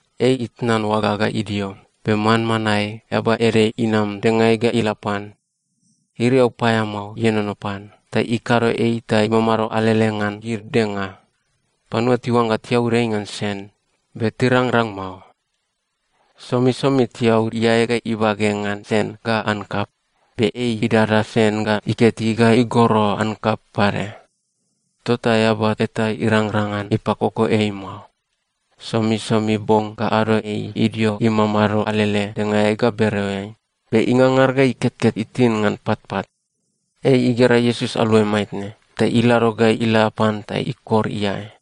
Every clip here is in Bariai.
Ei itnan oaga ga idio, be manmanae eaba ede inam dengaeai ga ila pan. Iriau paeamao ienono pan ta ikado ei ta imamado alele ngan gid denga. Panua tiuangga tiaud ei ngan sen, be tirangrang mao. Somisomi tiaud iae ga ibage ngan sen ga ankap, be ei idada sen ga iketi ga igoro ankap pade. Tota eaba eta irangrang ngan ipakoko ei mao. Somisomi bong ga ado ei idio imamado alele dengaeai ga bereoeai, be ingangar ga iketket itin ngan patpat. Ei igera Iesus aluai maitne, ta ilado ga ila pan ta ikor iae.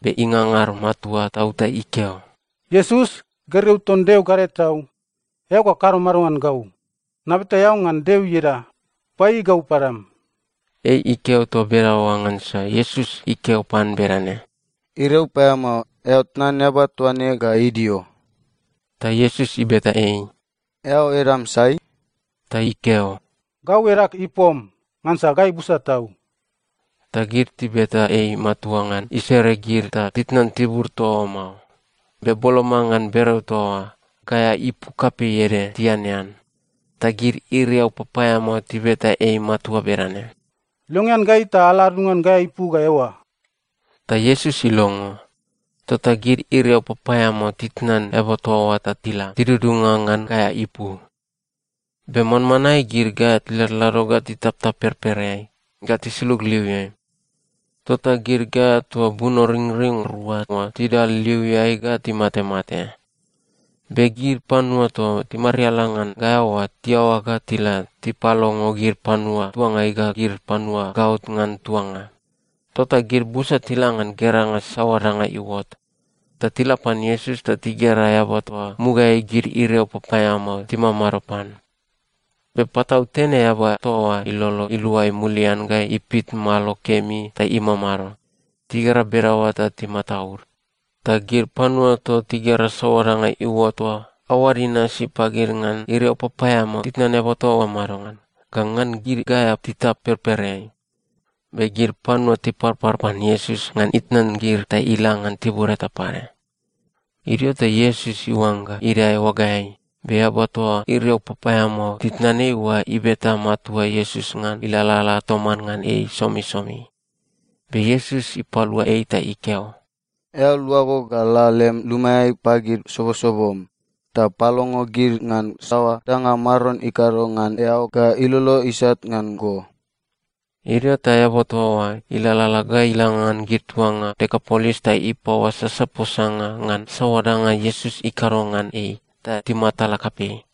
Be ingangar matua tau ta ikeo, “Iesus, gergeu ton Deo Gadae Tau, eao ga kado mado ngan gau? Nabeta eao ngan Deo ieda, paieiei gau padam.” Ei ikeo toa bedaoa ngansa Iesus ikeo pan bedane, “Iriau paeamao, eao tnan eaba toa ne ga idio!” Ta Iesus ibeta ei, “Eao edam sai?” Ta ikeo, “Gau edag Ipom, ngansa gai busa tau.” Ta gid tibeta ei matua ngan isere gid ta titnan tibur toa oa mao. Be boloma ngan bereo toa oa, gaea ipu kapei ede tianean. Ta gid iriau papaeamao tibeta ei matua bedane, “Longean gai ta ala adudunga ngan gaea ipu ga eoa.” Ta Iesus ilongo. Tota gid iriau papaeamao titnan eaba toa oa ta tila tidudunga ngan gaea ipu. Be manmanae gid gaea tiladlado ga titaptap perpereai ga tisulug liuiai. Tota gid gaea toa bunoringring rua oa tidal liuiai ga timatemate. Be gid panua toa timariala ngan gaea oa tiaoa ga tila tipalongo gid panua tuangai ga gid panua gaot ngan tuanga. Tota gid busa tila ngan geranga saoa danga iuot. Ta tila pan Iesus ta tigera eaba toa mugaeai gid iriau papaeamao timamado pan. Be patautene eaba toa oa ilolo iluai mulian ga ipit malo kemi ta imamado. Tigera bedaoa ta timataud. Ta gid panua toa tigera saoa danga iuot oa aoad inasi pagid ngan iriau papaeamao titnan eaba toa oa madongan, ga ngan gid gaea titap perpereai. Be gid panua tiparpar pan Iesus ngan itnan gid ta ila ngan tibur eta pade. Idio ta Iesus iuangga idae oagaeai, be eaba toa iriau papaeamao titnan ei oa ibeta matua Iesus ngan ilalala toman ngan ei somisomi. Be Iesus ipalua ei ta ikeo, “Eao luago ga la lem lumaeai pagid sobosobom, ta palongo gid ngan saoa danga Maron ikado ngan eao ga ilolo isat ngan go.” Idio ta eaba toa oa ilalala ga ila ngan gid tuanga Dekapolis ta ipaoasasa posanga ngan saoa danga Iesus ikado ngan ei, ta timatala kapei.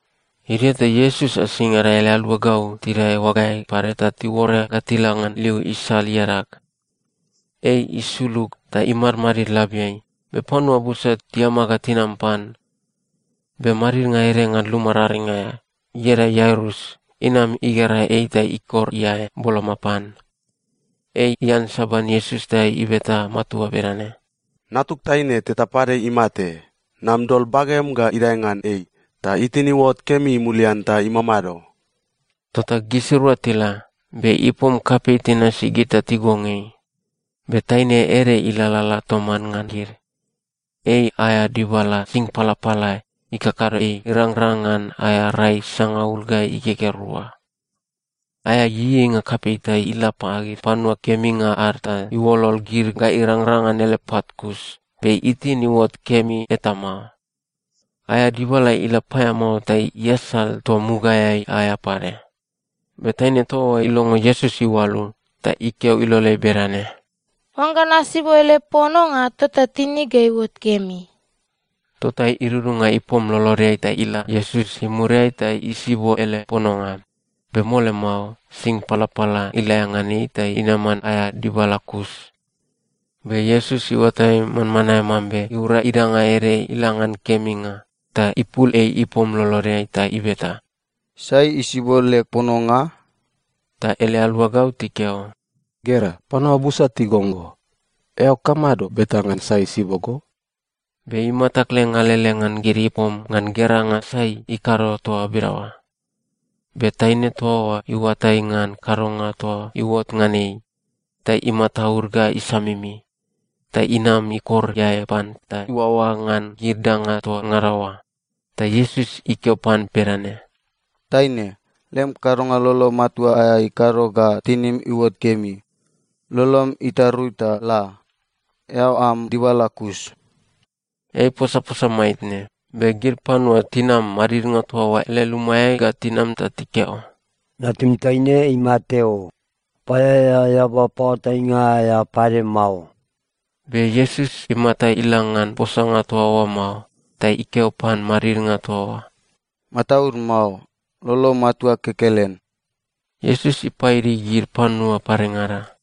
Idio ta Iesus asingada ele aluagau tidae oagaeai pade ta tiuore ga tila ngan liu isal iadag. Ei isulug ta imadmadid labiai, be panua busa tiama ga tinam pan. Be madidnga ede ngan luma raring aea, ieda Iairus, inam igera ei ta ikor iae boloma pan. Ei iansaban Iesus ta ibeta matua bedane, “Natug taine teta pade imate. Nam dol bagem ga idae ngan ei, ta itin iuot kemi mulian ta imamado.” Tota gisirua tila, be ipom kapei tinasi gid ta tigong ei. Be taine ede ilalala toman ngan gid. Ei aea dibala sing palapala ikakado ei irangrang ngan aea rai sangaul ga igegea rua. Aea ieieinga kapei ta ila pagid panua keminga ad ta iuolol gid ga irangrang ngan ele pat kus, be itin iuot kemi eta mao. Aea dibala ila paeamao ta iasal toa mugaeai aea pade. Be taine toa oa ilongo Iesus iualu, ta ikeo iloleai bedane, “Oangga nasibo ele pononga, tota tinig ga iuot kemi.” Tota idudunga ipom lolodeai ta ila Iesus imuriai ta isibo ele pononga. Be mole mao, sing palapala ilaea ngan ei ta inaman aea dibala kus. Be Iesus iuatai manmanae mambe iura idanga ede ila ngan keminga, ta ipul ei ipom lolodeai ta ibeta, “Sai isibo leg pononga?” Ta ele aluagau tikeo, “Gera, panua busa tigong go. Eao kamado beta ngan sai isibo go?” Be imata kleng alele ngan gid ipom ngan geranga sai ikado toa bedaoa. Be taine toa oa iuatai ngan kadonga toa iuot ngan ei, ta imataud ga isamimi. Ta inam ikor iae pan ta iuaoa ngan gid danga toa ngada oa. Ta Iesus ikeo pan bedane, “Taine, lem kadonga lolo matua aea ikado ga tinim iuot kemi. Lolom itarui ta la. Eao am dibala kus.” Ei iposaposa maitne, be gid panua tinam madidnga toa oa ele lumaeai ga tinam ta tikeo, “Natum taine imate o. Paeaea eaba paoatainga aea ne pade mao.” Be Iesus imata ila ngan posanga toa oa mao ta ikeo pan madidnga toa oa, “Mataud mao. Lolom matua kekelen.” Iesus ipaidi gid panua padengada,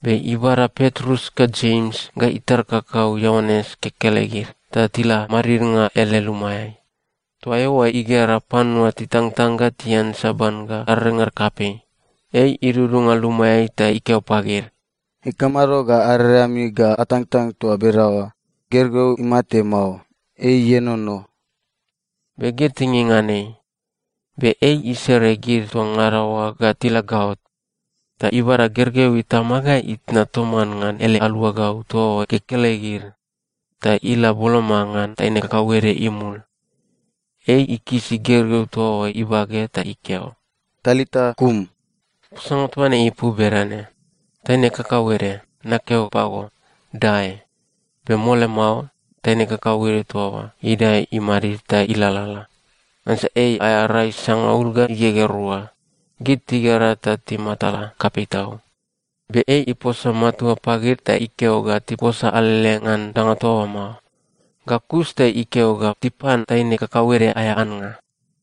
be ibada Petrus ga Jems ga itar kakau Ioanes kekelegid ta tila madidnga ele lumaeai. Toa eoa igera panua titangtang ga tiansaban ga arerengad kapei. Ei idudunga lumaeai ta ikeo pagid, “Ikamado ga arerengami ga atangtang toa bedaoa? Gergeu imate mao. Ei ienono.” Be gid tinging ngan ei. Be ei isere gid toa ngada oa ga tila gaot. Ta ibada gergeu itama ga itna toman ngan ele aluagau toa oa kekelegid, ta ila boloma ngan taine kakauede imul. Ei ikisi gergeu toa oa ibage ta ikeo, “Talita kum.” (Posanga toa ne ipu bedane, “Taine kakauede, nakeo pago, dae!”) Be mole mao, taine kakauede toa oa idae imadid ta ilalala. Ngansa ei aea rai sangaul ga igegea rua. Gid tigera ta timatala kapei tau. Be ei iposa matua pagid ta ikeo ga tiposa alele ngan danga toa oa mao. Ga kus ta ikeo ga tipan taine kakauede aea annga.